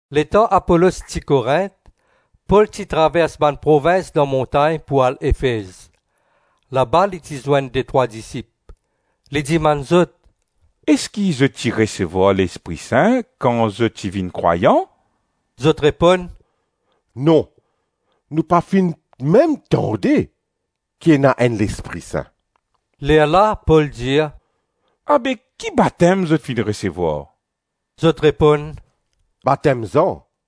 Letan Apolos ti Korint, Pol ti travers bann provins dan montagn pou al Efez. Laba li ti zwenn detrwa disip. Li dimann zot, “Eski zot ti resevwar Lespri Sin kan zot ti vinn krwayan?” Zot reponn, “Non, nou pa finn mem tande ki ena enn Lespri Sin.” Lerla Pol dir, “Abe ki batem zot finn resevwar?” Zot reponn, “Batem Zan.”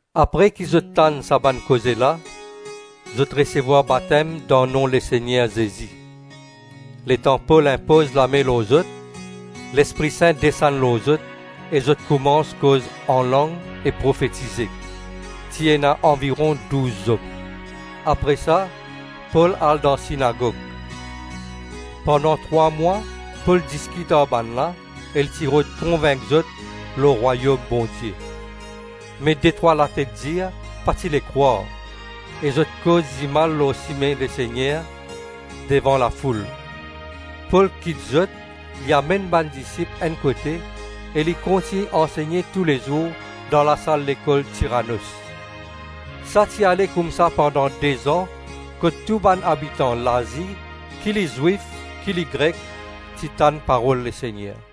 Apre ki zot tann sa bann koze la, zot resevwar batem dan nom Lesegner Zezi. Letan Pol inpoz lame lor zot, Lespri Sin desann lor zot e zot koumans koz anlang e profetize. Ti ena anviron douz zom. Apre sa Pol al dan sinagog. Pandan trwa mwa Pol diskit ar bannla e li ti rod konvink zot lor Rwayom Bondie. Me detrwa latet-dir pa ti le krwar e zot koz dimal lor Sime Lesegner devan la foul. Pol kit zot, li amenn bann disip enn kote e li kontign ansegne toulezour dan lasal lekol Tiranos. Sa ti ale koumsa pandan de-zan kot tou bann abitan Lazi, ki li Zwif ki li Grek, ti tann parol Lesegner.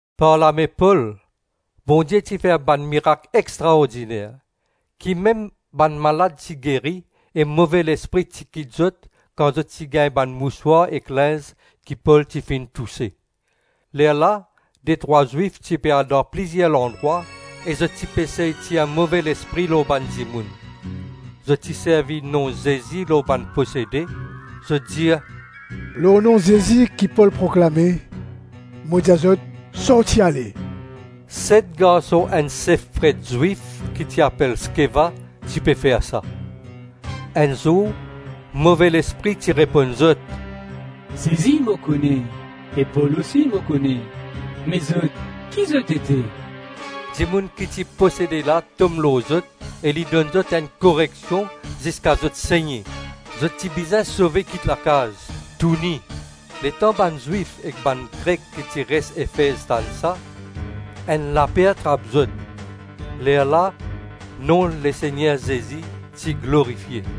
Par lame Pol, Bondie ti fer bann mirak extraordiner, ki mem bann malad ti geri e move lespri ti kit zot kan zot ti gagn bann mouswar ek linz ki Pol ti finn touse. Lerla detrwa Zwif ti pe al dan plizir landrwa e zot ti pe sey tir move lespri lor bann dimoun. Zot ti servi nom Zezi lor bann posede, zot dir, “Lor nom Zezi ki Pol proklame, mo dir zot sorti ale.” Set garson enn sef pret Zwif ki ti apel Skeva ti pe fer sa. Enn zour move lespri ti reponn zot, “Zezi mo kone, e Pol osi mo kone; me zot ki zot ete?” Dimoun ki ti posede la tom lor zot e li donn zot enn koreksion ziska zot senie, zot ti bizin sove kit lakaz, touni. Letan bann Zwif ek bann Grek ki ti res Efez tann sa, enn laper trap zot; lerla nom Lesegner Zezi ti glorifie.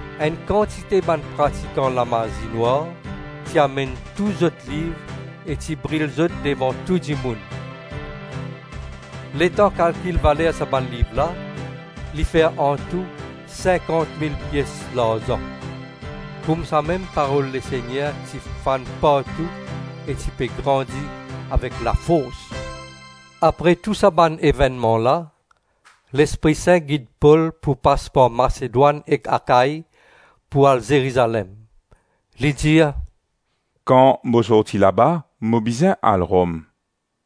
Enn kantite bann pratikan lamazi-nwar ti amenn tou zot liv e ti bril zot devan tou dimoun. Letan kalkil valer sa bann liv la, li fer antou sinkant mil pies larzan. Koumsamem parol Lesegner ti fann partou e ti pe grandi avek lafors. Apre tou sa bann evennman la, Lespri Sin gid Pol pou pas par Masedwann ek Akai pou al Zerizalem. Li dir, “Kan mo sorti laba, mo bizin al Rom.”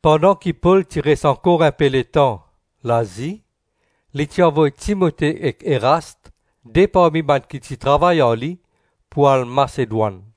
Pandan ki Pol ti res ankor inpe letan Lazi, li ti avoy Timote ek Erast, de parmi bann ki ti travay ar li, pou al Masedwann.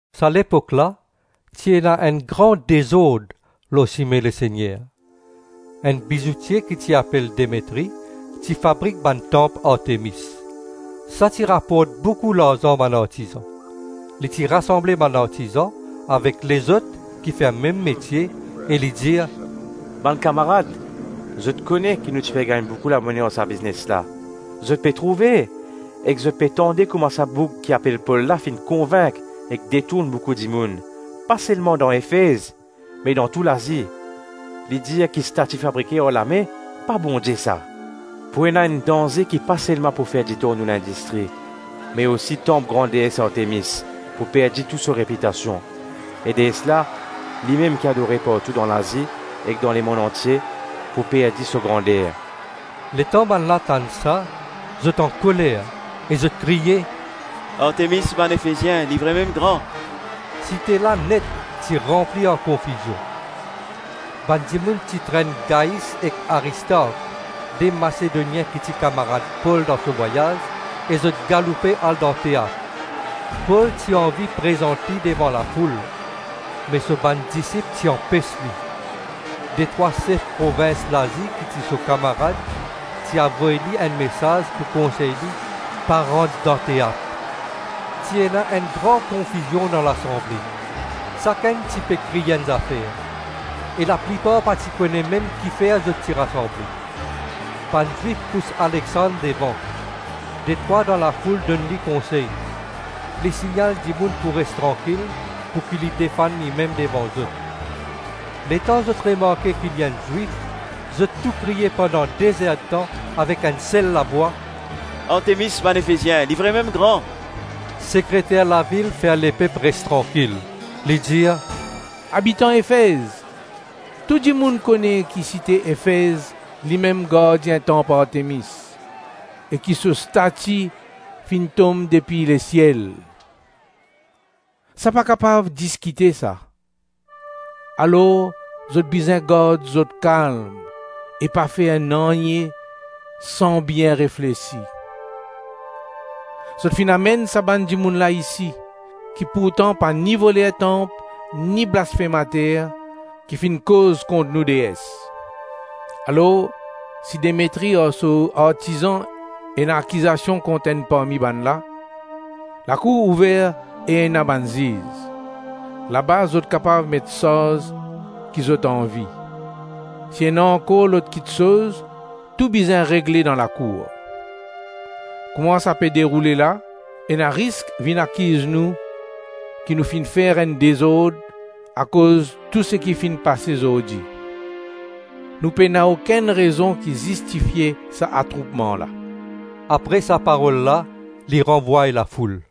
Sa lepok la ti ena enn gran dezord lor size Sime Lesegner. Enn bizoutie ki apel Demetri ti fabrik bann tanp Artemis; sa ti raport boukou larzan bann artizan. Li ti rasanble bann artizan, avek lezot ki fer mem metie e li dir, “Bann kamarad, zot kone ki nou ti pe gagn boukou lamone ar sa biznes la. Zot pe trouve ek zot pe tande kouma sa boug ki apel Pol la finn konvink ek detourn boukou dimoun, pa selma dan Efez me dan tou Lazi. Li dir ki stati fabrike ar lame, pa Bondie sa. Pou ena enn danze ki pa selma pou fer ditor nou lindistri, me osi tanp gran dees Artemis pou perdi tou so repitasion; e dees la limem ki adore partou dan Lazi ek dan lemonn antie, pou perdi so grander.” Letan bannla tann sa zot ankoler e zot kriye, “Artemis bann Efezien li vremem gran!” Site la net ti ranpli ar konfizion. Bann dimoun ti trenn Gais ek Aristark, de Masedonien ki ti kamarad Pol dan so vwayaz, e zot galoupe al dan teat. Pol ti anvi prezant li devan lafoul, me so bann disip ti anpes li. Detrwa sef provins Lazi ki ti so kamarad ti avoy li enn mesaz pou konsey li pa rant dan teat. Ti ena gran konfizion dan lasanble. Sakenn ti pe kriy enn zafer. E laplipar pa ti kone mem kifer zot ti rasanble. Bann Zwif pous Alexand devan; detrwa dan lafoul donn li konsey. Li signal dimoun pou res trankil, pouki li defann limem devan zot. Letan zot remarke ki li enn Zwif zot tou kriye pandan de zer-tan avek enn sel lavwa, “Artemis bann Efezien li vremem gran!” Sekreter lavil fer lepep res trankil, li dir, “Abitan Efez, tou dimoun kone ki site Efez limem gardien tanp Artemis e ki so stati finn tom depi lesiel. Sa, pa kapav diskite sa. Alor, zot bizin gard zot kalm e pa fer nanye san bien reflesi. Zot finn amenn sa bann dimoun la isi, ki pourtan pa ni voler tanp, ni blasfemater ki finn koz kont nou dees. Alors, si Demetri ar so artizan ena akizasion kont enn parmi bannla, lakour ouver e ena bann ziz; laba zot kapav met sarz ki zot anvi. Si ena ankor lot kiksoz, tou bizin regle dan lakour. Kouma sa pe deroule la, ena risk vinn akiz nou ki nou finn fer enn dezord akoz tou seki finn pase zordi. Nou pena okenn rezon ki zistifie sa atroupman la.” Apre sa parol la li ranvway lafoul.